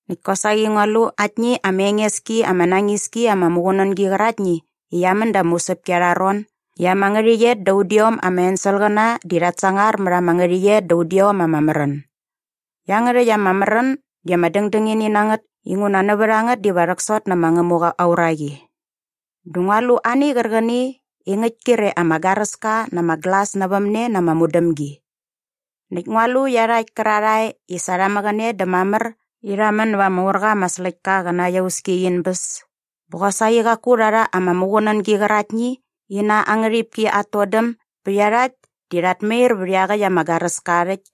Näkt kosaqi ngua lu aktni ama enges ki ama nañis ki ama muqunängi qäraktni i qia män da ama usäpki arha ron i ama ngärhäqyet da udiom ama enselqäna di rhat sangar mät ama ngärhäqyet da udiom ama märän. Iangärhäkt ama märän di ama dängdängini na ngät inguna nävät a ngät diva rhäksot nä ma Ngämuqa aa uraqi. Dä ngua lu ani qärqäni i ngäkt kre ama garäska na ama glas nävämne na ama mudämgi. Näkt ngua lu iarhakt kärarhae i sa rha mäqäne dä mamär i rha män näva ama ur qa ama släktka qä na aa iauski in bäs bä qosaqi qaku rha rha ama muqunängi qäraktni i na aa ngärhipki at todäm bä iarhakt di rhat mair vät iaqäkt ama garäska aa rhäkt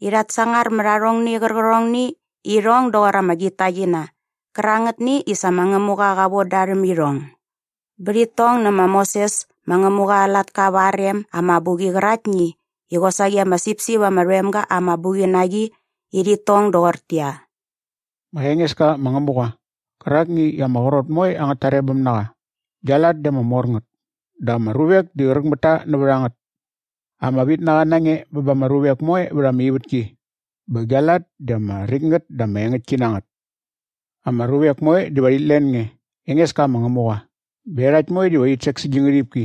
i rhat sangar mät arhongni qärqärhongni i irhong doqor ama gitaqina qärangätni i sa ma Ngämuqa qa von da rhäm irhong bä rhit tong nä ma Moses ma Ngämuqa aa latka va aa rem aa mabuqi qäraktni i qosaqi ama sipsip ama rhoem ga aa mabuqi na qi i rhit tong doqortäqyia, “Ma Engeska ma Ngämuqa qärakni i ama qrot moe angät tarebäm na qa, gia lat di ama mor ngät dä ama ruvek di qräqräk mät ta nävät a ngät! Ama vitnaqa na nge bä ba ama ruvek moe vät ama ivätki bä gia lat di ama räkt ngät dä ama engäktki na ngät! Ama ruvek moe diva rhit len nge, Engeska ma Ngämuqa, bä iarhakt moe diva rhit sek sä gi ngärhipki.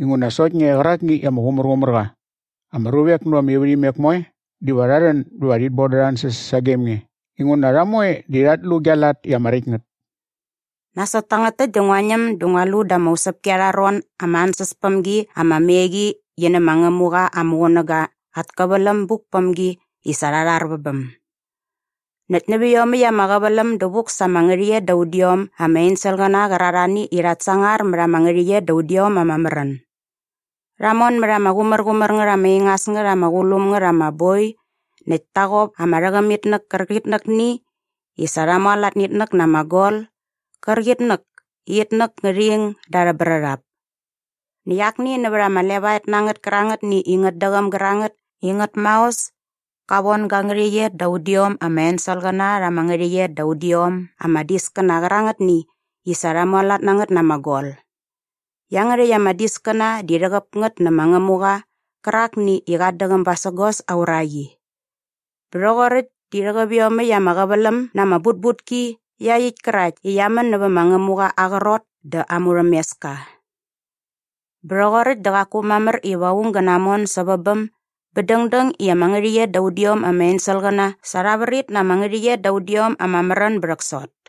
Inguna sokt nge qärakni i ama qumärqumär qa. Ama ruvek nävät ama ivärhimek moe diva rha rhän bä va rhit bon da arha ansäs sagem nge inguna rha moe di rhat lu gia lat i ama räkt ngät.” Nasot tangät täkt dä ngua ñäm dä ngua lu da ama usäpki arha ron ama ansäspämgi ama me qi nä ma Ngämuqa aa muqunäga at käväläm muk päm gi i sa rha rhar vä bäm. Näkt nävä iomäkt ama qäväläm dä vuk sa ama ngärhäqyet da udiom ama enselqäna qärarhani i rhat sangar mät ama ngärhäqyet da udiom ama märän. Rha mon mät ama qumärqumär ngät ama ingas ngät ama qulum ngät ama boi näkt ta qop ama rhängämitnäk kärqitnäkni i sa rha mualat nä itnäk na ama gol qärqitnäk i itnäk ngä ing da arhä brärhap. Näkt akni nävät ama levaet na ngät kärangätni i ngät däqäm gärangät i ngät maos ka von ga ngärhäqyet da udiom ama enselqäna rha ama ngärhäqyet da udiom ama diskäna qärangätni i sa rha mualat na ngät na ama gol. Iangärhäkt ama diskäna di rhäqäp ngät nä ma Ngämuqa qärakni i qat däqäm basägos aa uraqi. Bä rhoqoräkt di rhäqäp iomäkt ama qäväläm na ama butbutki iaqyäkt kärakt i qia män nävät ma Ngämuqa aa qrot dä aa murhämeska. Bä rhoqoräkt dä qaku mamär iva aung gä namon sävä bäm bä dängdäng i ama ngärhäqyet da udiom ama enselqäna sa rha vrit na ama ngärhäqyet da udiom ama märän bä rhäksot.